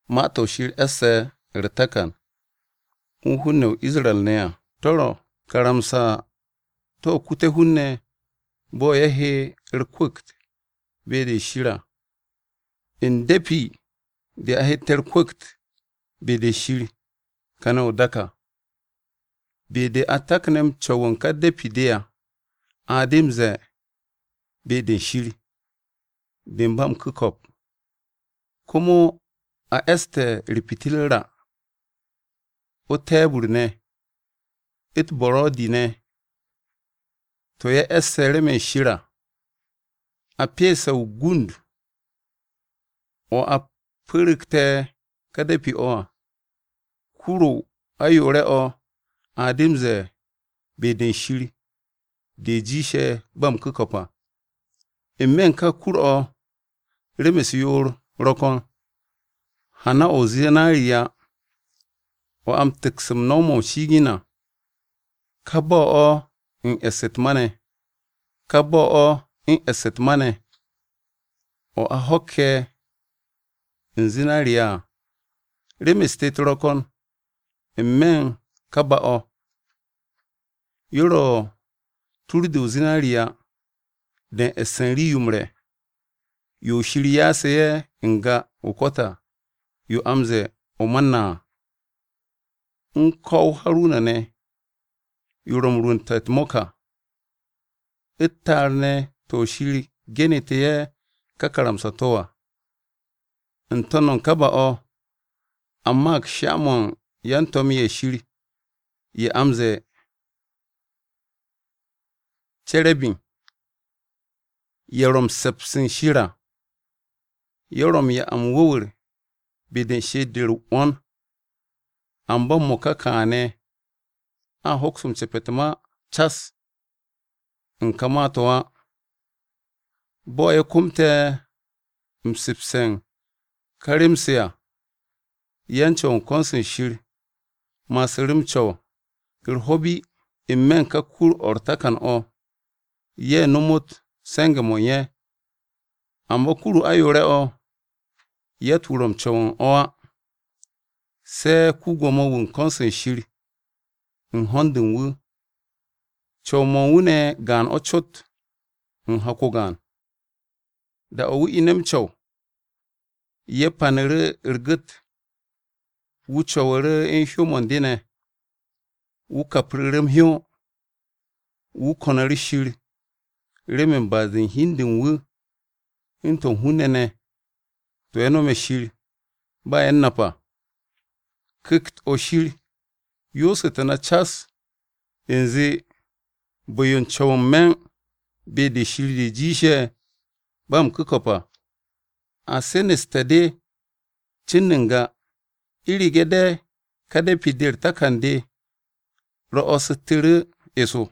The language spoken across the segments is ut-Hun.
Ma-to̱ Shir e̱sse̱ u̱r-takan u̱n hun-ne̱ ye̱ o-Isra-ne̱ à, to̱ ro̱ karamsa-to̱ kute̱ hun-ne̱ bo̱ ye̱ he u̱r-kwu̱kt be-de Shir à. U̱n de̱pi-de a hette̱ u̱r-kwu̱kt be-de Shir kane̱ o-dak à. Be-de a takne̱ m-co̱w u̱n ka de̱pi-de à, a de m-ze̱e̱, “Be-de Shir, de u̱n ba m-ku̱ko̱p.” Komo a e̱ste̱ u̱r-pitirra, o-te̱e̱bu̱r ne̱, u̱t-buro̱di ne̱ to̱ ye̱ e̱sse̱ remen Shir à. A pyese̱ o-gund, o̱ a pu̱ru̱gte̱ kà de̱pi-o̱ à, kur-o ayoore̱-o̱, a de m-ze̱e̱, “Be-de Shir de jiishe̱ ba m-ku̱ko̱p à.” N-me̱ u̱n ka kur-o̱ rem-u̱s yoor ro̱ ko̱n: hana-o̱ o-zinariya (o̱ atte̱ m-tu̱ks u̱n no̱w-mo̱ m-shi'igin à), ka ba-o̱ u̱n e̱ss u̱t-ma, o̱ a ho̱kke̱ u̱n zinariya à. Rem-u̱s tet ro̱ ko̱n n-me̱ u̱n kà ba-o̱: Yo ro̱ tur-de o-zinariya (de u̱n e̱ss u̱n rii-yo m-re̱, yo Shir ya'as ye̱ n-ga o-ko̱t à, yo a m-ze̱e̱ o-Mana à), U̱n ko̱-o Haruna ne̱ (yo ro̱ u̱n rwu̱nte̱ u̱t-mo̱k à), U̱t-ta'ar ne̱ to̱ Shir genu̱te̱ ye̱ ka karamsa-to̱ à. N-to̱n u̱n ka ba-o̱ a maag sha-mo̱ u̱n yan-to̱m-ye̱ Shir ye̱ a m-ze̱e̱ Cerebim à. Ye̱ ro̱ m-se̱ps u̱n Shir à, ye̱ ro̱ u̱n 'ya m-wu̱wu̱r be-de u̱n she'et-de u̱r-'wo̱n. Amba m-mo̱ka kaane̱ a hoks ce̱p u̱t-ma cas u̱n kà ma-to̱ á. Bo̱ ye̱ komte̱ se̱e̱bse̱ u̱n ka rem-se à, yan-Co̱w u̱n ko̱n-se Shir ma'asu̱ru̱ m-co̱w u̱r-ho̱ bi n-me̱ u̱n ka kur-o̱ u̱r-takan o̱, ye̱ nomot se̱nge̱-mo̱ u̱n ye̱. Amba kur-o ayoore̱-o̱, yatt-wu̱ ro̱ m-co̱w u̱n o̱ á, se̱ ko-Gwo̱mo-wu̱ u̱n ko̱n-se Shir u̱n ho̱n-de u̱n wu̱. Co̱w-mo̱ u̱n wu̱ ne̱ gaan-o̱ cot u̱n hak-o gaan. Da-o̱ wu̱ ine̱ m-co̱w, ye̱ panu̱ru̱ u̱r-gu̱t, wu̱ co̱wu̱ru̱ u̱n hyó-mo̱ u̱n de ne̱, wu̱ kapru̱ru̱ m-hyó, wu̱ ko̱nu̱ru̱ Shir remen ba'as-de u̱n hi u̱n de u̱n wu̱, u̱n to̱ u̱n hun-ne̱ ne̱, to̱ ye̱ nome̱ Shir ba ye̱ u̱n nap á. Ku̱kt-o̱ Shir yoosu̱tu̱ na cas u̱nze bu̱-yo m-co̱w n-me̱ u̱n “Be-de Shir de jiishe̱ ba m-ku̱ko̱p à” a seneste̱ de cin n-ga u̱rege̱ de ká de̱pi-de u̱r-takan de ro̱'o̱su̱tu̱ru̱ eso.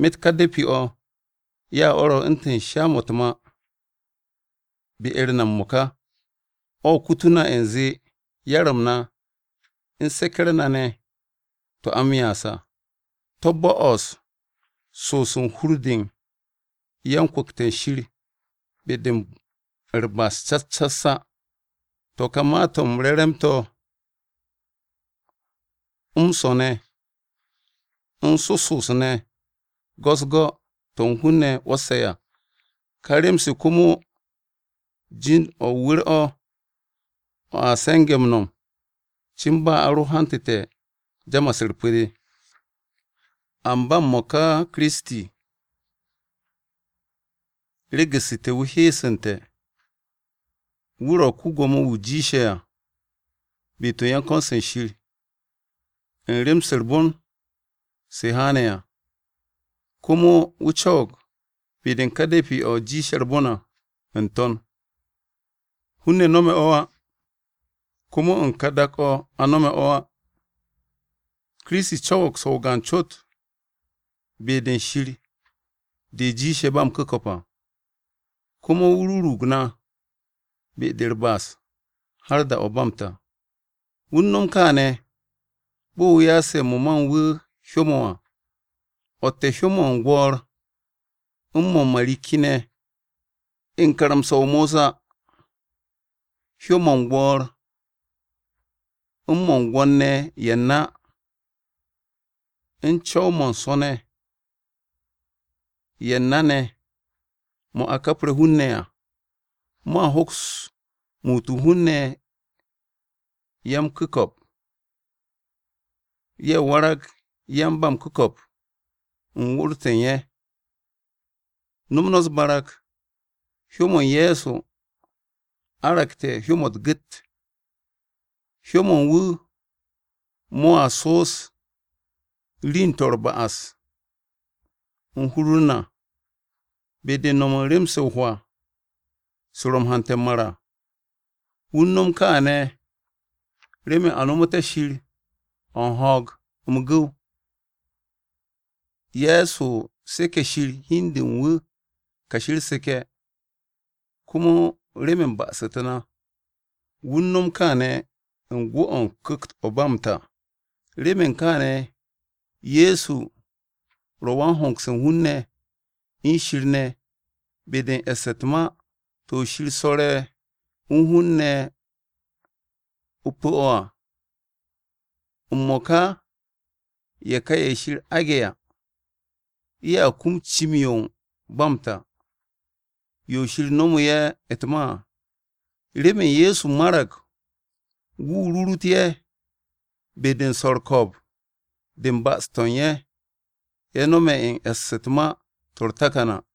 Myet ka de̱pi-o̱, ya o̱ ro̱ u̱ntu̱n sha-mo̱ u̱t-ma be-u̱r na m-mo̱ka, o̱ kutu̱ na u̱nze yar-m na u̱n seke̱-u̱r na ne̱ to̱ a m-ya'as à, to̱ bo'os so'os u̱n hur-de u̱n yan-kwu̱kte̱ u̱n Shir be-de u̱r-ba'as cas cas á. To̱ kà ma-to̱ m-re̱ to̱ m-swo̱ ne̱, u̱n soso'os ne̱ go̱s-u̱s go̱, to̱ hun-ne̱ 'wo̱sse̱ à. Ká rem-se komo jind-o̱ o-wu̱r o̱, o̱ a se̱nge̱ m-no̱m cin ba a ro hantu̱te̱ jamas-u̱r pu̱-de à. Amba m-mo̱ka Kiristi, regu̱ssu̱te̱ wu̱ heesu̱nte̱. Wu̱ ro̱ ko-Gwo̱mo-wu̱ jiishe̱ à be-to̱ u̱n yan-ko̱n-se Shir, u̱n rem-se u̱r-bon se haane̱ à. Komo wu̱ co̱wo̱g be-de u̱n ká de̱pi-o̱ jiishe̱ à ba u̱r-re̱e̱b n-To̱n, hun-ne̱ no̱me̱ o̱ á, komo u̱n kà dak-o̱ a nome̱ o̱ á. Kiristi co̱wo̱g so̱ o-gaan cot “Be-de u̱n Shir de jiishe̱ ba m-ku̱ko̱p à,” komo wu̱ rurug na be-de u̱r-ba'as har da-o̱ ba m-ta. Wu̱ u̱n no̱m kaane̱ bo̱ wu̱ ya'ase̱ mo̱ ma u̱n wu̱ hyó-mo̱ à, o̱tte̱ hyó-mo̱ u̱n gwo̱o̱r u̱n mo̱ u̱n marikki-ne̱ à. U̱n karamsa-o Mosa, hyó-mo̱ u̱n gwo̱o̱r u̱n mo̱ u̱n gwo̱n-ne̱ ye̱ u̱n na u̱n co̱w-mo̱ u̱n so̱-ne̱ ye̱ u̱n na-ne̱ mo̱ a kapre̱ hun-ne̱ à, mo̱a hoks muut u̱n hun-ne̱ ya-m-ku̱ko̱p, ye̱ warag yan-ba-m-ku̱ko̱p u̱n wu̱r-to̱ u̱n ye̱. No̱m no̱ u̱s-barag, hyó-m Ye̱so Kiristi argte̱ hyó-mo̱ u̱t-gu̱t! Hyó-mo̱ u̱n wu̱ mo̱a so'os ri'in-to̱ u̱r-ba'as u̱n hur-u̱r na be-de u̱n no̱m u̱n rem-se o-hwaa se ro̱ m-hante̱ m-mar à. Wu̱ u̱n nom kaane̱ remen a nomoté̱ Shir o̱ u̱n ho̱o̱g, m-gu̱w. Ye̱so seke̱ Shir hi u̱n de u̱n wu̱ kashi u̱r-seke̱ komo remen ba'as-u̱t na. Wu̱ no̱m kaane̱ u̱n gwu̱-o̱ u̱n Ku̱kt-o̱ ba m-ta. Remen kaane̱, Ye̱so ro̱ wan-hongse̱ u̱n hun-ne̱ u̱n Shir ne̱ be-de u̱n e̱ss u̱t-ma to̱ Shir swo̱re̱ o-nu u̱n hun-ne̱ ne̱ o-pu̱ o̱ à. M-mo̱ka ye̱ ka ye̱ Shir aage̱ à, ye̱a kum cim-yo ba m-ta, yo Shir nomu̱ ye̱ u̱t-ma à. Remen Ye̱so marag wu̱ rurut ye̱ be-de u̱n swo̱ u̱r-ko̱o̱b de u̱n ba'as-to̱ ye̱ no̱me̱ u̱n e̱ss u̱t-ma to̱ u̱r-takan à.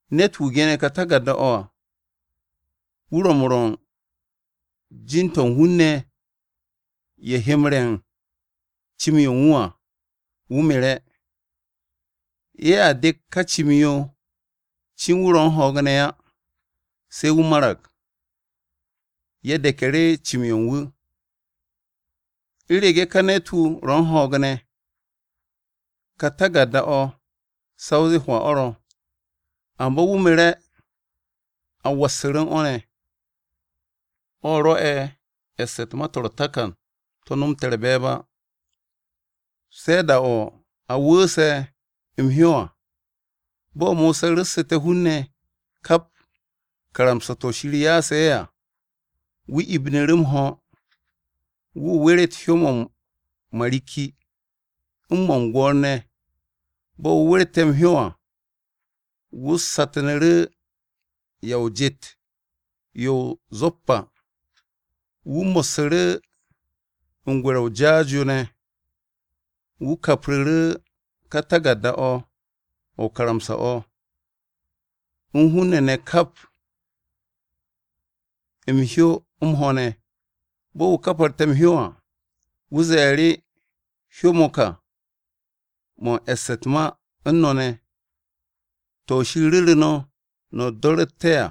Ne̱t-wu̱ ge̱ne̱ o-taku̱rda à, wu̱ ro̱ m-rwo̱ u̱n jin-to̱ u̱n hun-ne̱ ye̱ he m-re̱ u̱n cìm-yo u̱n wu̱ à wu̱ mere̱. Ye̱a dek ka cìm-yo cin wu̱ ro̱ u̱n ho̱o̱g ne̱ á. Se̱ wu̱ marag, ye̱ de̱ku̱ru̱ cìm-yo u̱n wu̱. U̱rege̱ ka ne̱t-wu̱ ro̱ u̱n ho̱o̱g ne̱, ka taku̱rda-o̱ sa o zee hwaa o̱ ro̱, amba wu̱ mere̱ a wassu̱ru̱ u̱n o̱ ne̱. O̱ rwo̱'e̱ e̱ss u̱t-ma to̱ u̱r-takan to̱ nomte̱ u̱r-be̱e̱b á, se̱ da-o̱ a wu̱u̱se̱ m-hyó à. Bo̱ Mosa ru̱ssu̱te̱ hun-ne̱ kap karamsa-to̱ Shir ya'ase̱ ye̱ à, wu̱ ibinu̱ru̱ m-ho̱, wu̱ weret hyó-mo̱ u̱n marikki u̱n mo̱ u̱n gwo̱o̱r ne̱. Bo̱ wu̱ werte̱ m-hyó à, wu̱ satnu̱ru̱ ya o-jet yo o-zoppa, wu̱ mo̱ssu̱ru̱ u̱n gwe̱re̱-o o-jaas yo ne̱, wu̱ kapru̱ru̱ ká taku̱rda-o̱ o-karamsa o̱, u̱n hun-ne̱ ne̱ kap m-hyó m-ho̱ ne̱. Bo̱ wu̱ kaparte̱ m-hyó à, wu̱ ze̱e̱ru̱, “Hyó-mo̱ kà mo̱ u̱n e̱ste̱ u̱t-ma u̱n no̱ ne̱, to̱ Shir ru̱ru̱ no̱, no̱ do̱ru̱te̱ à.”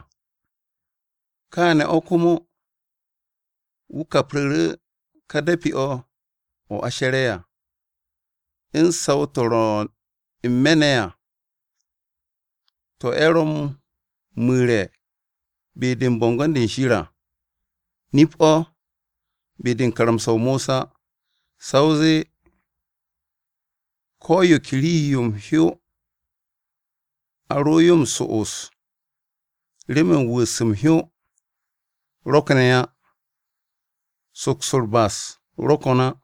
Kaane̱ o̱ komo, wu̱ kapru̱ru̱ ká de̱pi-o̱ o̱ a she̱re̱ à, u̱n saw-to̱ ro̱ n-me̱ ne̱ à, to̱ ye̱ ro̱ m-mu̱re̱ be-de u̱n bo̱ngo̱n-de Shir à. Nip-o̱, be-de u̱n karamsa-o Mosa, sa o zee ko̱ yo ke rii-yo m-hyó a ro yo m-so'os, remen wu̱u̱s m-hyó rokne̱ á, soks u̱r-ba'as ro̱ ko̱n á.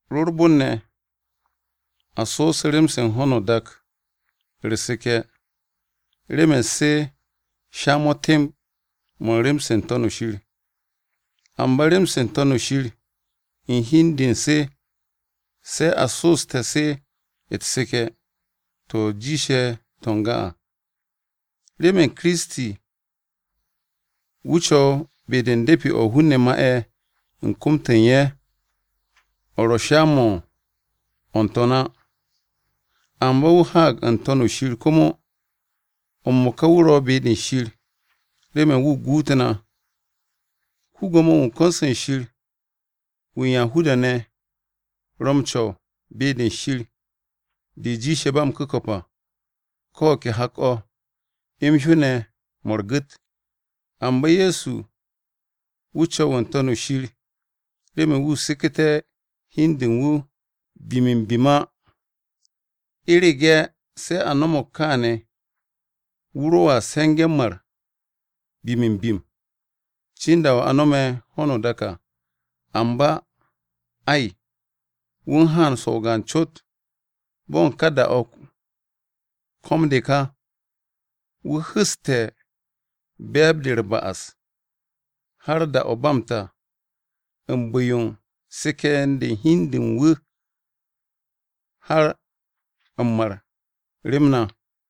Ro u̱r-bon ne̱, a so'os rem-se u̱n ho̱no o-dak u̱r-seke̱ remen se sha-mo̱ temb mo̱ u̱n rem-se n-To̱n shir, amba rem-se n-To̱n shir u̱n hi u̱n de u̱n se, se a so'oste̱ se u̱t-seke̱, to̱ jiishe̱ to̱ n-ga à. Remen Kiristi wu̱ co̱w be-de u̱n de̱pi-o̱ hun-ne̱ ma'e̱ u̱n kom-to̱ u̱n ye̱, o̱ ro̱ sha-mo̱ u̱n o̱ n-To̱n á. Amba wu̱ haag n-To̱n shir komo, m-mo̱ka wu̱ ro̱ be-de Shir remen wu̱ guut na. Ko-Gwo̱mo-wu̱ u̱n ko̱n-se Shir wu̱ u̱n Yahuda-ne̱ ro̱ m-co̱w “Be-de Shir de jiishe̱ ba m-ku̱ko̱p à” ko o̱ ke hak-o̱ m-hyó ne̱ mo̱ u̱r-gu̱t. Amba Ye̱so wu̱ co̱w n-To̱n shir remen wu̱ seku̱té̱ hi u̱n de u̱n wu̱ bim-m-bim á. U̱rege̱ se a no̱mo̱g kaane̱, wu̱ ro̱a se̱nge̱ m-mar bim-m-bim, cin da-o̱ a nome̱ ho̱no o-dak à. Amba, ay, wu̱ u̱n haan so̱ o-gaan cot, bo̱ u̱n ka da-o̱ ko̱m-de ka. Wu̱ hu̱ste̱ be̱e̱b-de u̱r-ba'as har da-o̱ ba m-ta u̱n bu̱-yo u̱n seke̱-de u̱n hi-de u̱n wu̱ har m-mar rem na.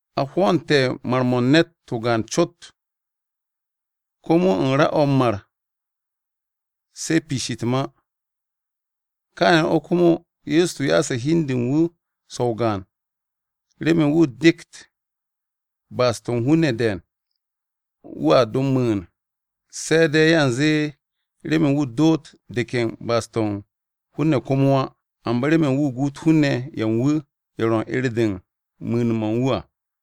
A hwo̱o̱nte̱ mar-mo̱ u̱n ne̱t o-gaan cot. Komo u̱n ra-o̱ m-mar se piish u̱t-ma. Kaane̱ o̱ komo Ye̱so Kiristi ya'ase̱ hi u̱n de u̱n wu̱ so̱ o-gaan remen wu̱ dekt ba'as-to̱ u̱n hun-ne̱ de̱e̱n. Wu̱a do m-mu̱u̱n, se̱ de̱ yanze remen wu̱ doot de̱k u̱n ba'as-to̱ u̱n hun-ne̱ komo á, amba remen wu̱ guut hun-ne̱ ye̱ u̱n wu̱ ye̱ ro̱ u̱n 'er-de u̱n mu̱u̱n-mo̱ u̱n wu̱ à.